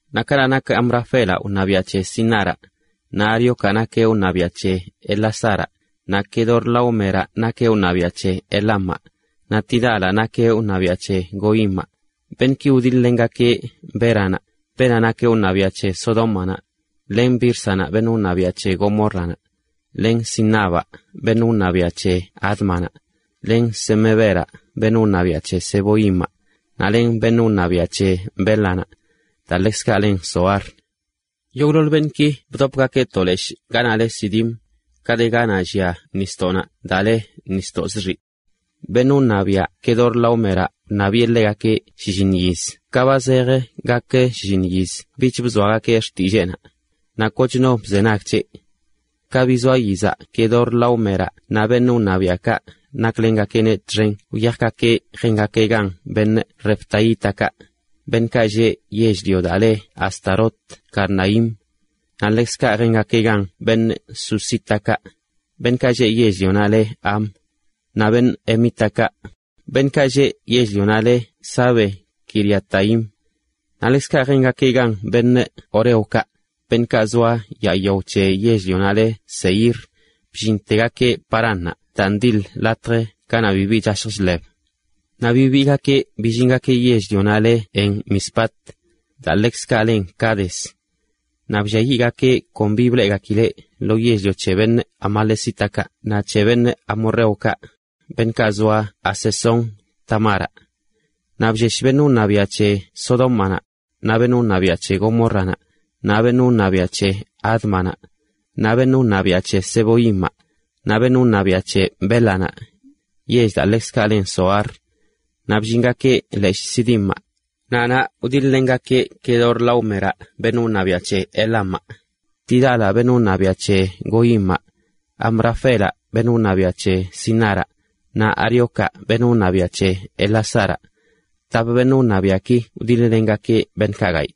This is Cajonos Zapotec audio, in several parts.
Naꞌ kanaꞌ nak Amrafelaꞌ wṉabiaꞌ c̱he Sinaraꞌ, naꞌ Ariocaꞌ nakeꞌ wṉabiaꞌ c̱he Elasaraꞌ, naꞌ Quedorlaómeraꞌ nakeꞌ wṉabiaꞌ c̱he Elamaꞌ, naꞌ Tidalaꞌ nakeꞌ wṉabiaꞌ c̱he Goimaꞌ. Beṉꞌki wdiḻ-lengakeꞌ Béranaꞌ, beenaꞌ nak wṉabiaꞌ c̱he Sodómanaꞌ, len Bírsanaꞌ, beṉꞌ wṉabiaꞌ c̱he Gomórranaꞌ, len Sinabaꞌ beṉꞌ wṉabiaꞌ c̱he Ádmanaꞌ, len Semeberaꞌ beṉꞌ wṉabiaꞌ c̱he Zeboimaꞌ, naꞌ len beṉꞌ wṉabiaꞌ c̱he Bélanaꞌ, daa ḻekzkaꞌ len Zoar. Yogꞌḻoḻ beṉꞌki bdopgakeꞌ to leshꞌ ganaꞌ le Sidim, ka de ganaꞌ llia nisdoꞌnaꞌ daa le Nisdoꞌ Zxiꞌ. Beṉꞌ wṉabiaꞌ Quedorlaómeraꞌ wṉabiꞌe ḻegakeꞌ shlliṉ yiz ka ba zejə gak shiiṉ yiz bich bzoagakeꞌ xtilleenaꞌ, naꞌ koch no bzenag c̱heꞌ. Ka bizoa yizaꞌ Quedorlaómeraꞌ naꞌ beṉꞌ wṉabiaꞌkaꞌ naklengakeꞌneꞌ txen wyajgakeꞌ jengakeꞌ gan refaítakaꞌ, beṉꞌkaꞌ lleꞌ yell-lio daa le Astarot Karnaim, naꞌ ḻekzkaꞌ jengakeꞌ gan zuzítakaꞌ, beṉꞌkaꞌ lleꞌ yell-lionaꞌ le Ham, naꞌ emítakaꞌ, beṉꞌkaꞌ lleꞌ yell-lionaꞌ le Save-quiriataim, naꞌ ḻekzkaꞌ jengakeꞌ gan horeokaꞌ, beṉꞌkaꞌ zoa yaa yao c̱he yell-lionaꞌ le Seir, bllintegakeꞌ Paránnaꞌ daa ndiḻ latj ganaꞌ bibi chashj chḻeb. Naꞌ bibiigakeꞌ billingakeꞌ yell-lionaꞌ le En-mispat, daa ḻekzkaꞌ len Cades, naꞌ blliayiꞌgakeꞌ kon bi bleꞌgakileꞌ lo yell-lio c̱he amalecítakaꞌ naꞌ c̱he amorreokaꞌ, beṉꞌkaꞌ zoa Hazezon-tamaraꞌ. Naꞌ bllesh beṉꞌ wṉabiaꞌ c̱he Sodómanaꞌ, naꞌ beṉꞌ wṉabiaꞌ c̱he Gomórranaꞌ, naꞌ beṉꞌ wṉabiaꞌ c̱he Ádmanaꞌ, naꞌ beṉꞌ wṉabiaꞌ c̱he Zeboimaꞌ, naꞌ beṉꞌ wṉabiaꞌ c̱he Bélanaꞌ, yell daa ḻekzkaꞌ len Zoar. Naꞌ bllingakeꞌ leshꞌ Sidimaꞌ, naꞌ naꞌ wdiḻ-lengakeꞌ Quedorlaómeraꞌ, beṉꞌ wṉabiaꞌ c̱he Elamaꞌ, Tidalaꞌ beṉꞌ wṉabiaꞌ c̱he Goimaꞌ, Amrafelaꞌ beṉꞌ wṉabiaꞌ c̱he Sinaraꞌ, naꞌ Ariocaꞌ beṉꞌ wṉabiaꞌ c̱he Elasaraꞌ. Tap beṉꞌ wṉabiaꞌki wdiḻ-lengakeꞌ beṉꞌkaꞌ gayꞌ.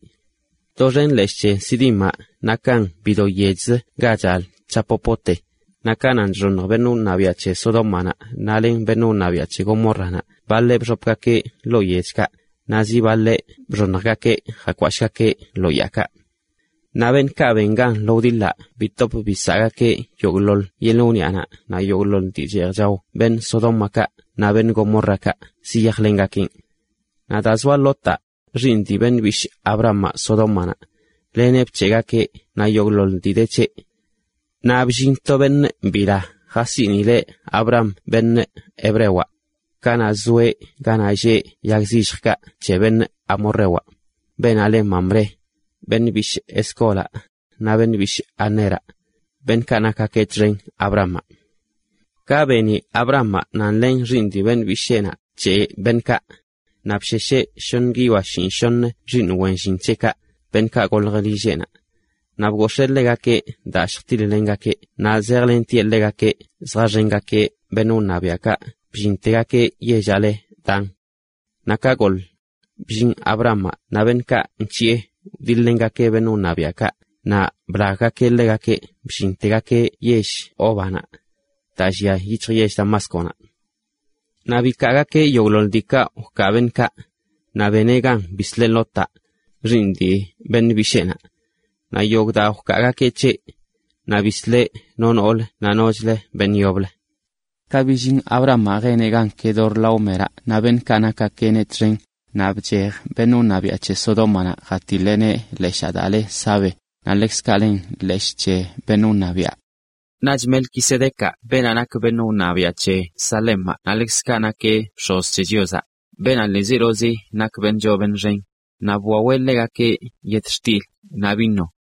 Doxen leshꞌ c̱he Sidimaꞌ nakan bido yechzə ga chal chapopote, naꞌ ka nan chxoṉj beṉꞌ wṉabiaꞌ c̱he Sodómanaꞌ naꞌ len beṉꞌ wṉabiaꞌ c̱he Gomórranaꞌ baḻeꞌ bxopgakeꞌ ḻoo yechkaꞌ, naꞌ zi baḻeꞌ bxoṉjgakeꞌ jakwashꞌgakeꞌ lo yaakaꞌ. Naꞌ beṉꞌkaꞌ ben gan lo wdiḻaꞌ bitop bisaꞌgakeꞌ yogꞌḻoḻ yeḻꞌ wniꞌanaꞌ naꞌ yogꞌḻoḻ dii cheej chao beṉꞌ Sodómakaꞌ naꞌ beṉꞌ Gomórrakaꞌ ziyajlengakeꞌn. Naꞌ daa zoa Lotaꞌ, xiiṉ dii beṉꞌ bishꞌ Abramaꞌ, Sodómanaꞌ, leneꞌ bc̱heꞌgakeꞌ naꞌ yogꞌḻoḻ dii de c̱heꞌ. Naꞌ bllin to beṉꞌ bila jasiꞌnileꞌ Abram beṉꞌ hebrewaꞌ, kanaꞌ zoeꞌ ganaꞌ lleꞌ yag zilljkaꞌ c̱he beṉꞌ amorrewaꞌ, beenaꞌ le Mamré, beṉꞌ bishꞌ Escólaꞌ, naꞌ beṉꞌ bishꞌ Aneraꞌ, beṉꞌkaꞌ nak Abramaꞌ txen. Ka beni Abramaꞌ nan len xiiṉ dii beṉꞌ bisheenaꞌ bc̱heꞌ beṉꞌkaꞌ, naꞌ bshesheꞌ shoṉə guiyoa shinꞌshoṉə xiiṉ wen llin c̱heꞌkaꞌ, beṉꞌkaꞌ golj lilleꞌnaꞌ. Naꞌ bgox̱ee ḻegakeꞌ daa lljtiḻ-lengakeꞌ naꞌ zejlentieꞌ ḻegakeꞌ zjaxengakeꞌ beṉꞌ wṉabiaꞌkaꞌ bllintegakeꞌ yellaꞌ le Dan. Naꞌ ka goḻ, bllin Abramaꞌ naꞌ beṉꞌkaꞌ nc̱hiꞌe wdiḻ-lengakeꞌ beṉꞌ wṉabiaꞌkaꞌ naꞌ blaggakeꞌ ḻegakeꞌ bllintegakeꞌ yell Hóbanaꞌ, daa llia yic̱hj yell Damásconaꞌ. Naꞌ bikaagakeꞌ yogꞌḻoḻ diikaꞌ wkaa beṉꞌkaꞌ, naꞌ beneꞌ gan bisleꞌ Lotaꞌ, xiiṉ dii beṉꞌ bisheenaꞌ, naꞌ yogꞌ daa wkaagakeꞌ c̱heꞌ, naꞌ bisleꞌ no nool naꞌ nochlə beṉꞌ yoblə. Ka billin Abramaꞌ jeneꞌ gan Quedorlaómeraꞌ naꞌ beṉꞌkaꞌ nakgakeꞌneꞌ txen, naꞌ bchej beṉꞌ wṉabiaꞌ c̱he Sodómanaꞌ jatiḻeꞌneꞌ leshaa daa le Save, naꞌ ḻekzkaꞌ len Leshꞌ c̱he Beṉꞌ Wṉabiaꞌ. Naꞌch Melquisedecaꞌ beenaꞌ nak beṉꞌ wṉabiaꞌ c̱he Salemaꞌ naꞌ ḻekzkaꞌ nakeꞌ bx̱oz c̱he Chiozaꞌ, beenaꞌ ḻiizelozi nak beṉꞌ choo beṉꞌ xen, naꞌ bwaweꞌ ḻegakeꞌ yetxtil naꞌ vino,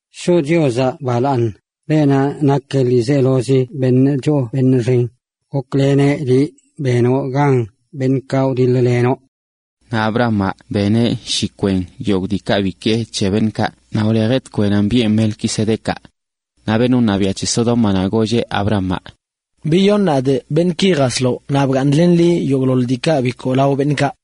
Shoꞌ Chiozaꞌ balaaṉ, beenaꞌ nak ḻiizelozi beṉꞌ choo beṉꞌ xen, gokleneꞌ liꞌ benoꞌ gan beṉꞌkaꞌ wdiḻ-lenoꞌ.” Naꞌ Abramaꞌ beneꞌ shi kwen yogꞌ diikaꞌ bikee c̱he beṉꞌkaꞌ naꞌ wlejeꞌ tkwenana biꞌen Melquisedecaꞌ. Naꞌ beṉꞌ wṉabiaꞌ c̱he Sodómanaꞌ golleꞌ Abramaꞌ: ―Biyoṉ nadꞌ beṉꞌki jasloꞌ naꞌ bgaaṉlen liꞌ yogꞌḻoḻ diikaꞌ bikoo lao beṉꞌkaꞌ.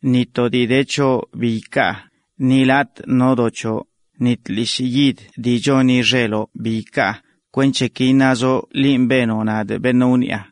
ni to dii de c̱hoꞌ bi ikaa, ni latꞌ no do c̱hoꞌ, ni tlishꞌ yid dii choni xeloꞌ bi ikaa, kwenc̱he ki iṉazoꞌ linꞌ benoꞌ nadꞌ beṉꞌ wniꞌa.